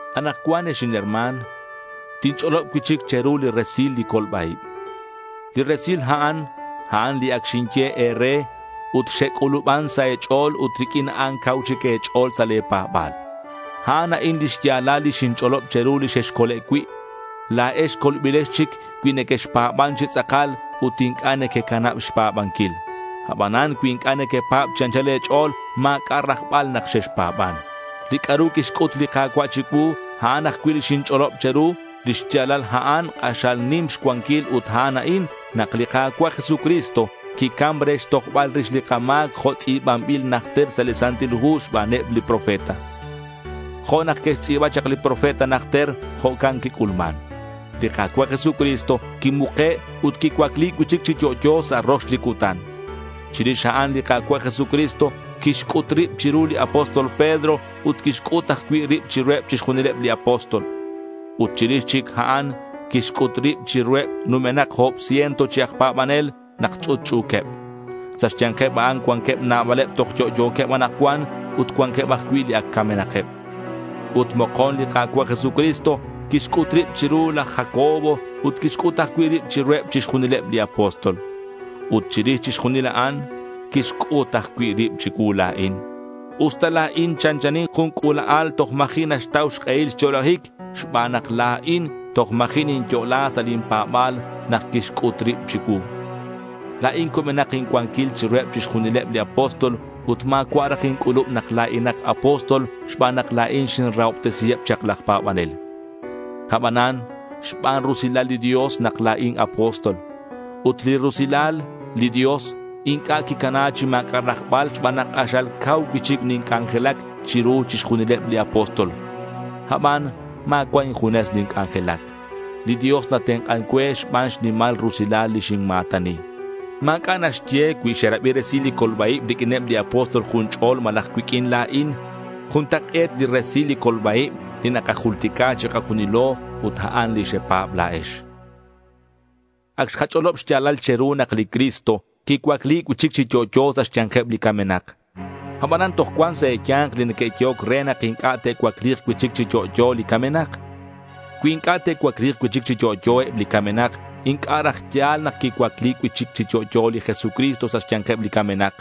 Anakcuan ex inherma̱n, tinch'olob cui'chic che̱ru li resil li colba-ib. Li resil a'an, a'an li ac xinye e̱re ut xec'u̱luban sa' e̱ch'o̱l ut riq'uin a'an cau chic e̱ch'o̱l sa' le̱ pa̱ba̱l. A'an a'in li xya̱lal li xinch'olob che̱ru, li xexcole' cui'. La̱ex colbilex chic cui nequexpa̱ban chi tz'akal ut inc'a' nequecanab xpa̱banquil. Abanan cui inc'a' nequepa̱b chi anchal e̱ch'o̱l, ma̱c'a' rajbal nak xexpa̱ban. Li c'a'ru quixc'ut li Ka̱cua' chicuu, a'an ajcui' li xinch'olob che̱ru. Lix ya̱lal a'an k'axal nim xcuanquil ut a'an a'in: nak li Ka̱cua' Jesucristo quicam re xtojbal rix li kama̱c jo' tz'i̱banbil najter sa' li Santil Hu xbaneb li profeta. Jo' nak que'xtz'i̱ba chak li profeta najter, jo'can quic'ulman. Li Ka̱cua' Jesucristo quimuke' ut quicuacli cui'chic chi yo'yo sa' rox li cutan. Chirix a'an li Ka̱cua' Jesucristo quixc'ut rib chiru li apóstol Pedro ut quixc'ut ajcui' rib chiruheb chixjunileb li apóstol. Ut chirix chic a'an quixc'ut rib chiruheb numenak o̱b ciento chi aj pa̱banel nak ch'utch'u̱queb. Sa' xya̱nkeb a'an cuanqueb nabaleb toj yo'yo̱queb anakcuan ut cuanqueb ajcui' li ac camenakeb. Ut mokon li Ka̱cua' Jesucristo quixc'ut rib chiru laj Jacobo ut quixc'ut ajcui' rib chiruheb chixjunileb li apóstol. Ut chirix chixjunil a'an, quixc'ut ajcui' rib chicuu la̱in, usta la̱in chanchanin jun c'ula'al toj ma̱ji' naxtau xk'ehil xyo'lajic xban nak la̱in toj ma̱ji' ninyo'la sa' lin pa̱ba̱l nak quixc'ut rib chicuu. La̱in cubenak incuanquil chiruheb chixjunileb li apóstol ut ma̱cua' raj inc'ulub nak la̱inak apóstol xban nak la̱in xinrahobtesiheb chak laj pa̱banel. Abanan xban rusilal li Dios nak la̱in apóstol. Ut li rusilal li Dios inc'a' quicana chi ma̱c'a' rajbal xban nak k'axal cau cui'chic ninc'anjelac chiru chixjunileb li apóstol. Aban ma̱cua' injunes ninc'anjelac. Li Dios natenk'an cue xban xnimal rusilal li xinma̱tani. Ma̱c'a' naxye cui xerabi resil li colba-ib riq'uineb li apóstol jun ch'ol malaj cuiq'uin la̱in. Juntak'e̱t li resil li colba-ib li nakajultica chikajunilo ut a'an li xepa̱b la̱ex. Ac xkach'olob xya̱lal che̱ru nak li Cristo quicuacli cui'chic chi yo'yo sa' xya̱nkeb li camenak. Abanan toj cuan sa' e̱ya̱nk li neque'yehoc re nak inc'a' te'cuacli̱k cui'chic chi yo'yo li camenak. Cui inc'a' te'cuacli̱k cui'chic chi yo'yo eb li camenak, inc'a' raj ya̱l nak quicuacli cui'chic chi yo'yo li Jesucristo sa xya̱nkeb li camenak.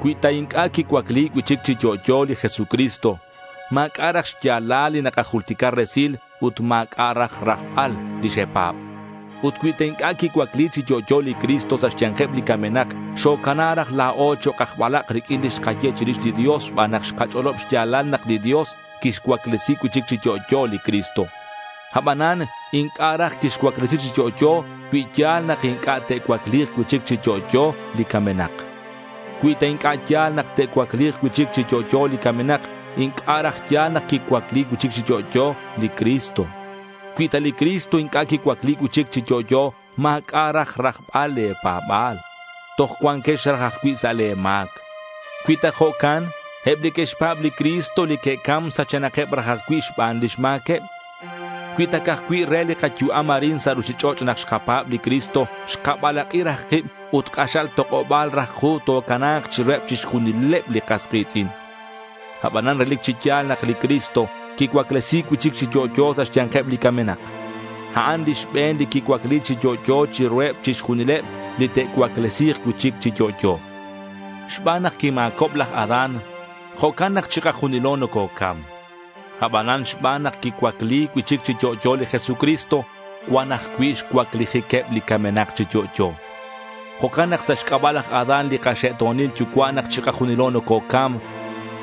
Cui ta inc'a' quicuacli cui'chic chi yo'yo li Jesucristo, ma̱c'a' raj xya̱lal li nakajultica resil, ut ma̱c'a' raj rajbal li xepa̱b. Ut cui ta inc'a' quicuacli chi yo'yo li Cristo sa' xya̱nkeb li camenak, xocana raj la̱o chok' aj balak' riq'uin li xkaye chirix li Dios xban nak xkach'olob xya̱lal nak li Dios quixcuaclesi cui'chic chi yo'yo li Cristo. Abanan inc'a' raj quixcuaclesi chi yo'yo cui ya̱l nak inc'a' te'cuacli̱k cui'chic chi yo'yo li camenak. Cui ta inc'a' ya̱l nak te'cuacli̱k cui'chic chi yo'yo li camenak, inc'a' raj ya̱l nak quicuacli cui'chic chi yo'yo li Cristo. Cui ta li Cristo inc'a' quicuacli cui'chic chi yo'yo, ma̱c'a' raj rajbal le̱ pa̱ba̱l. Toj cua̱nkex raj ajcui' sa' le̱ ma̱c. Cui ta jo'can, eb li que'xpa̱b li Cristo li que'cam sachenakeb raj ajcui' xban lix ma̱queb. Cui ta ca'aj cui' re li kayu'am arin sa' ruchich'och' nak xkapa̱b li Cristo, xkabalak'i raj kib ut k'axal tok'oba̱l raj ku tocana̱k chiruheb chixjunileb li kas ki̱tz'in. Abanan relic chi ya̱l nak li Cristo quicuaclesi̱c cui'chic chi yo'yo sa' xya̱nkeb li camenak. A'an li xbe̱n li quicuacli chi yo'yo chiruheb chixjunileb li te'cuaclesi̱k cui'chic chi yo'yo. Xban nak quima̱cob laj Adán, jo'can nak chikajunilo nococam. Abanan xban nak quicuacli cui'chic chi yo'yo li Jesucristo, cuan ajcui' xcuaclijiqueb li camenak chi yo'yo. Jo'can nak sa' xc'aba' laj Adán li kaxe'to̱nil yucua' nak chikajunilo nococam.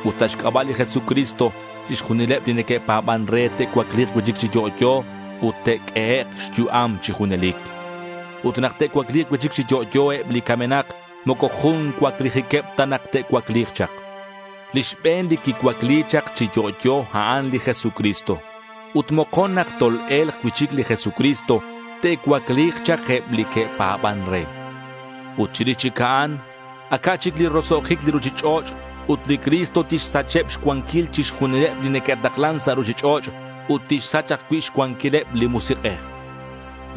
Ut sa' xc'aba' li Jesucristo, chixjunileb li neque'pa̱ban re te'cuacli̱k cui'chic chi yo'yo ut te'q'uehek' xyu'am chi junelic. Ut nak te'cuacli̱k cui'chic chi yo'yo eb li camenak, moco jun cuaclijiqueb ta nak te'cuacli̱k chak. Li xbe̱n li quicuacli chak chi yo'yo, a'an li Jesucristo. Ut mokon nak tol-e̱lk cui'chic li Jesucristo, te'cuacli̱k chak eb li que'pa̱ban re. Ut chirix chic a'an aca' chic li roso'jic li ruchich'och' ut li Cristo tixsacheb xcuanquil chixjunileb li neque'taklan sa' ruchich'och' ut tixsach ajcui' xcuanquileb li Musik'ej.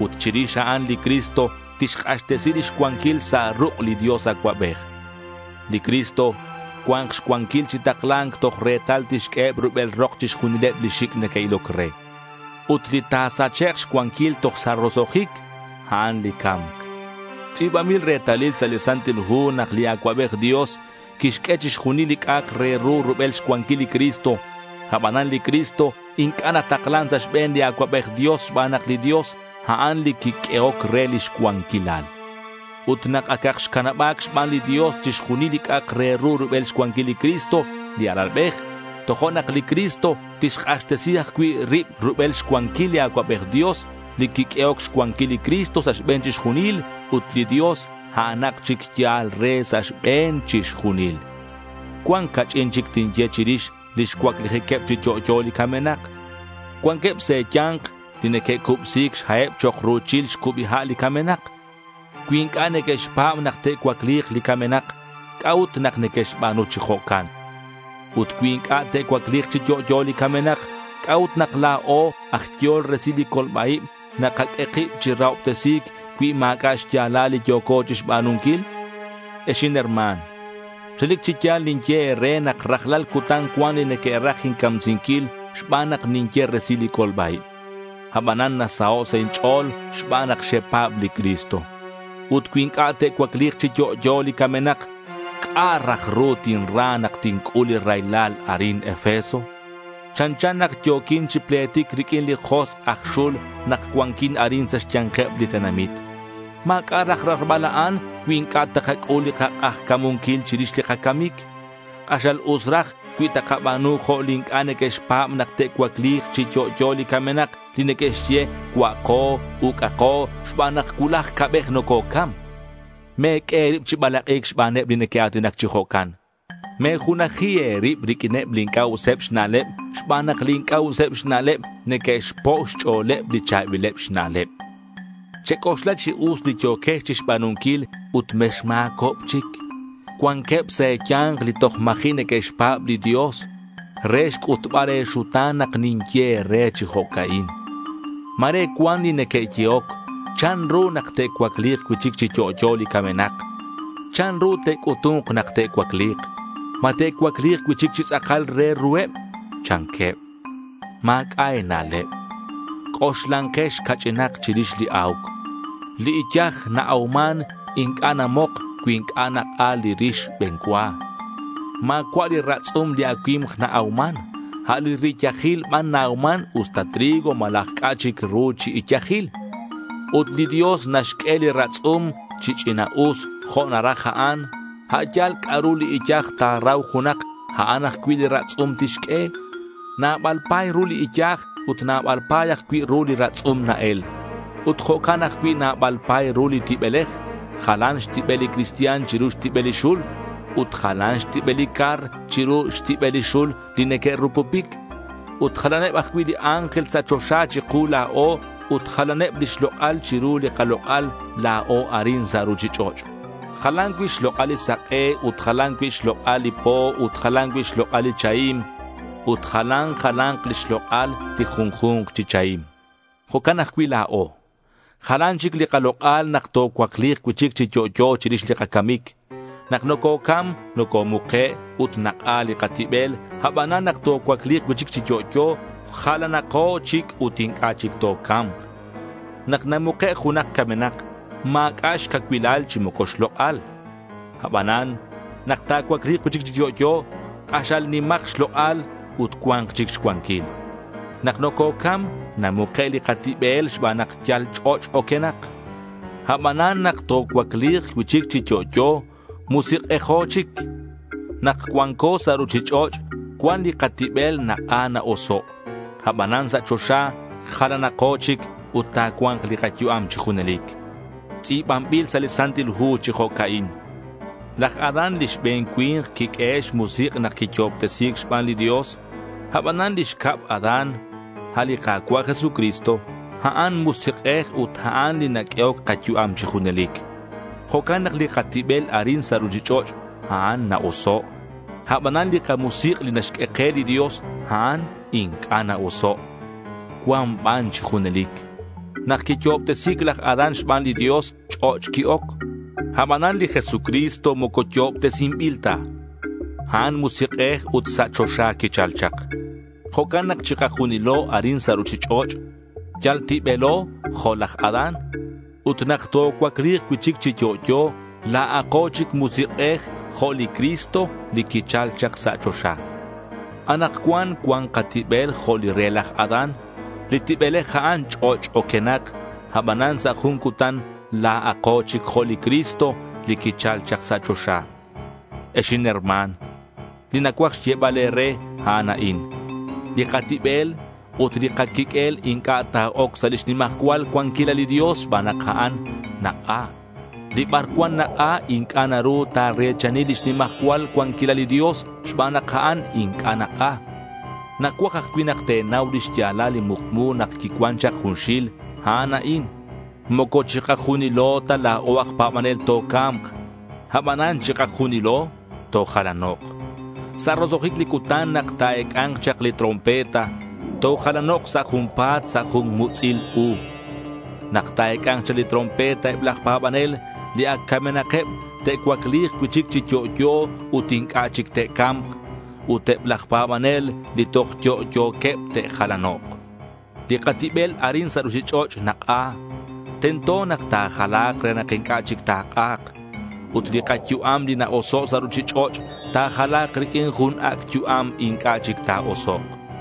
Ut chirix a'an li Cristo tixk'axtesi lix cuanquil sa' ruk' li Dios Acuabej. Li Cristo cua̱nk xcuanquil chi takla̱nc toj retal tixq'ueheb rubel rok chixjunileb li xic' neque'iloc re. Ut li ta̱sachek' xcuanquil toj sa' roso'jic, a'an li ca̱mc. Tz'i̱banbil retalil sa' li Santil Hu nak li Acuabej Dios quixq'ue chixjunil li c'a'ak re ru rubel xcuanquil li Cristo. Abanan li Cristo inc'a' nataklan sa' xbe̱n li Acuabej Dios xban nak li Dios, a'an li quiq'uehoc re lix cuanquilal. Ut nak acak xcanaba̱c xban li Dios chixjunil li c'a'ak re ru rubel xcuanquil li Cristo li Alalbej, tojo'nak li Cristo tixk'axtesi ajcui' rib rubel xcuanquil li Acuabej Dios, li quiq'uehoc xcuanquil li Cristo sa' xbe̱n chixjunil, ut li Dios a'anak chic yal re sa' xbe̱n chixjunil. Cuan ca'ch'in chic tinye chirix lix cuaclijiqueb chi yo'yo li camenak. Cuanqueb sa' e̱ya̱nk li neque'cubsi̱c xha'eb chok' ru̱chil xcubi ha' li camenak. Cui inc'a' neque'xpa̱b nak te'cuacli̱k li camenak, ¿c'a'ut nak neque'xba̱nu chi jo'can? Ut cui inc'a' te'cuacli̱k chi yo'yo li camenak, ¿c'a'ut nak la̱o aj yehol resil li colba-ib nakaq'ue kib chi rahobtesi̱c cui ma̱c'a' xya̱lal li yo̱co chixba̱nunquil? Ex inherma̱n, relic chi ya̱l ninye e̱re nak rajlal cutan cuan li neque'raj incamsinquil xban nak ninye resil li colba-ib. Abanan nasaho' sa' inch'o̱l xban nak xepa̱b li Cristo. Ut cui inc'a' te'cuacli̱k chi yo'yo li camenak, ¿c'a' raj ru tinra nak tinc'ul li raylal arin Efeso? Chanchan nak yo̱quin chi pletic riq'uineb li josk' aj xul nak cuanquin arin sa' xya̱nkeb li tenamit. Ma̱c'a' raj rajbal a'an cui inc'a' takac'ul kak'ajca̱munquil chirix li kacamic. K'axal us raj cui takaba̱nu jo' li inc'a' neque'xpa̱b nak te'cuacli̱k chi yo'yo li camenak li neque'xye cua'ako, uc'ako xban nak cuulaj ca'bej nococam. Me̱q'ue e̱rib chi balak'i̱c xbaneb li neque'a̱tinac chi jo'can. Me̱junaji e̱rib riq'uineb li inc'a' useb xna'leb xban nak li inc'a' useb xna'leb neque'xpo' xch'o̱leb li cha̱bileb xna'leb. Chec'oxla chi us li yo̱quex chixba̱nunquil ut mexma̱cob chic. Cuanqueb sa' e̱ya̱nk li toj ma̱ji' neque'xpa̱b li Dios. Re xc'utbal e̱xuta̱n nak ninye e̱re chi jo'ca'in. Ma̱re cuan li neque'yehoc, ¿chanru nak te'cuacli̱k cui'chic chi yo'yo li camenak? ¿Chanru te'c'utu̱nk nak te'cuacli̱k? ¿Ma te'cuacli̱k cui'chic chi tz'akal re ruheb? chanqueb. Ma̱c'a' e̱na'leb. C'oxlankex ca'ch'inak chirix li a̱uc. Li iyaj na-auman inc'a' namok cui inc'a' nak'a li rix xbe̱n cua. Ma̱cua' li ratz'um li acui̱mk na-auman. A' li riyajil ban na-auman usta trigo malaj c'a' chic ru chi iyajil. Ut li Dios naxq'ue li ratz'um chi ch'ina'us jo' naraj a'an. A' yal c'a'ru li iyaj ta̱rau junak, a'an ajcui' li ratz'um tixq'ue. Nabal pa̱y ru li iyaj ut nabal pa̱y ajcui' ru li ratz'um na-el. Ut jo'can ajcui' nabal pa̱y ru li tibelej. Jalan xtibel li cristian chiru xtibel li xul. Ut jalan xtibel li car chiru xtibel li xul li neque'rupupic. Ut jalaneb ajcui' li ángel sa' choxa chiku la̱o ut jalaneb lix lok'al chiru li kalok'al la̱o arin sa' ruchich'och'. Jalan cui' xlok'al li sak'e ut jalan cui' xlok'al li po ut jalan ajcui' xlok'al li chahim ut jalan jala̱nk lix lok'al li junju̱nk chi chahim. Jo'can ajcui' la̱o. Jalan chic li kalok'al nak tocuacli̱k cui'chic chi yo'yo chirix li kacamic. Nak nococam, nocomuke' ut nak'a li katibel, abanan nak tocuacli̱k cui'chic chi yo'yo jalanako chic ut inc'a' chic toca̱mk. Nak namuke' junak camenak ma̱c'a' xcacuilal chi moco xlok'al. Abanan nak ta̱cuacli̱k cui'chic chi yo'yo, k'axal nimak xlok'al ut cua̱nk chic xcuanquil. Nak nococam namuke' li katibel xban nak yal ch'och' oquenak. Abanan nak tocuacli̱k cui'chic chi yo'yo, musik'ejo chic. Nak cuanco sa' ruchich'och' cuan li katibel nak'a na-oso'. Abanan sa' choxa jalanako chic ut ta̱cua̱nk li kayu'am chi junelic. Tz'i̱banbil sa' li Santil Hu chi jo'ca'in: Laj Adán li xbe̱n cui̱nk quiq'uehe' xmusik' nak quiyo'obtesi̱c xban li Dios. Abanan li xcab Adán, a' li Ka̱cua' Jesucristo, a'an musik'ej ut a'an li naq'uehoc kayu'am chi junelic. Jo'can nak li katibel arin sa' ruchich'och', a'an na-oso'. Abanan li kamusik' li naxq'ue ke li Dios, a'an inc'a' na-oso'. Cuan ban chi junelic. Nak quiyo'obtesi̱c laj Adán xban li Dios, ch'och' qui-oc. Abanan li Jesucristo moco yo'obtesinbil ta. A'an musik'ej ut sa' choxa quichal chak. Jo'can nak chikajunilo arin sa' ruchich'och' yal tibelo jo' laj Adán. Ut nak tocuacli̱k cui'chic chi yo'yo, la̱ako chic musik'ej jo' li Cristo li quichal chak sa' choxa. Anakcuan cuan katibel jo' li re laj Adán. Li tibelej a'an ch'och' oquenak. Abanan sa' jun cutan la̱ako chic jo' li Cristo li quichal chak sa' choxa. Ex inherma̱n, li nacuaj xyebal e̱re, a'an a'in: li katibel ut li kaquiq'uel inc'a' ta̱oc sa' lix nimajcual cuanquilal li Dios xban nak a'an nak'a. Li bar cuan nak'a inc'a' naru ta̱re̱chani lix nimajcual cuanquilal li Dios xban nak a'an inc'a' nak'a. Nacuaj ajcui' nak te̱nau lix ya̱lal li mukmu nak quicuan chak junxil. A'an a'in: moco chikajunilo ta la̱o aj pa̱banel toca̱mk, abanan chikajunilo tojalanok'. Sa' roso'jic li cutan nak ta̱ec'a̱nk chak li trompeta, tojalanok' sa' junpa̱t sa' jun mutz'il u. Nak ta̱ec'a̱nk chak li trompeta eb laj pa̱banel li ac camenakeb te'cuacli̱k cui'chic chi yo'yo ut inc'a' chic te'ca̱mk. Ut eb laj pa̱banel li toj yo'yo̱queb te'jalanok'. Li katibel arin sa' ruchich'och' nak'a. Tento nak ta̱jala̱k re nak inc'a' chic ta̱k'a̱k. Ut li kayu'am li na-oso' sa' ruchich'och' ta̱jala̱k riq'uin jun ac' yu'am inc'a' chic ta̱osok'.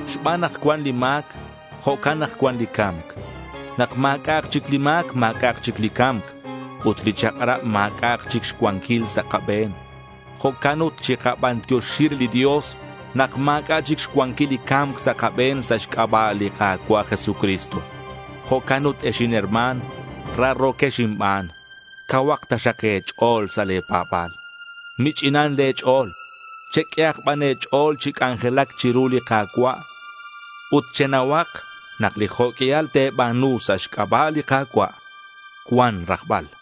Xban nak cuan li ma̱c, jo'can nak cuan li ca̱mc. Nak ma̱c'a'ak chic li ma̱c, ma̱c'a'ak chic li ca̱mc. Ut li chak'rab ma̱c'a'ak chic xcuanquil sa' kabe̱n. Jo'can ut chikabantioxi re li Dios nak ma̱c'a' chic xcuanquil li ca̱mc sa' kabe̱n sa' xc'aba' li Ka̱cua' Jesucristo. Jo'can ut ex inherma̱n, raro̱quex inban, cauhak taxak e̱ch'o̱l sa' le̱ pa̱ba̱l. Mich'inan le̱ ch'o̱l. Cheq'uehak ban e̱ch'o̱l chi c'anjelac chiru li Ka̱cua'. Ut chenauhak nak li jo' q'uial te̱ba̱nu sa' xc'aba' li Ka̱cua' cuan rajbal.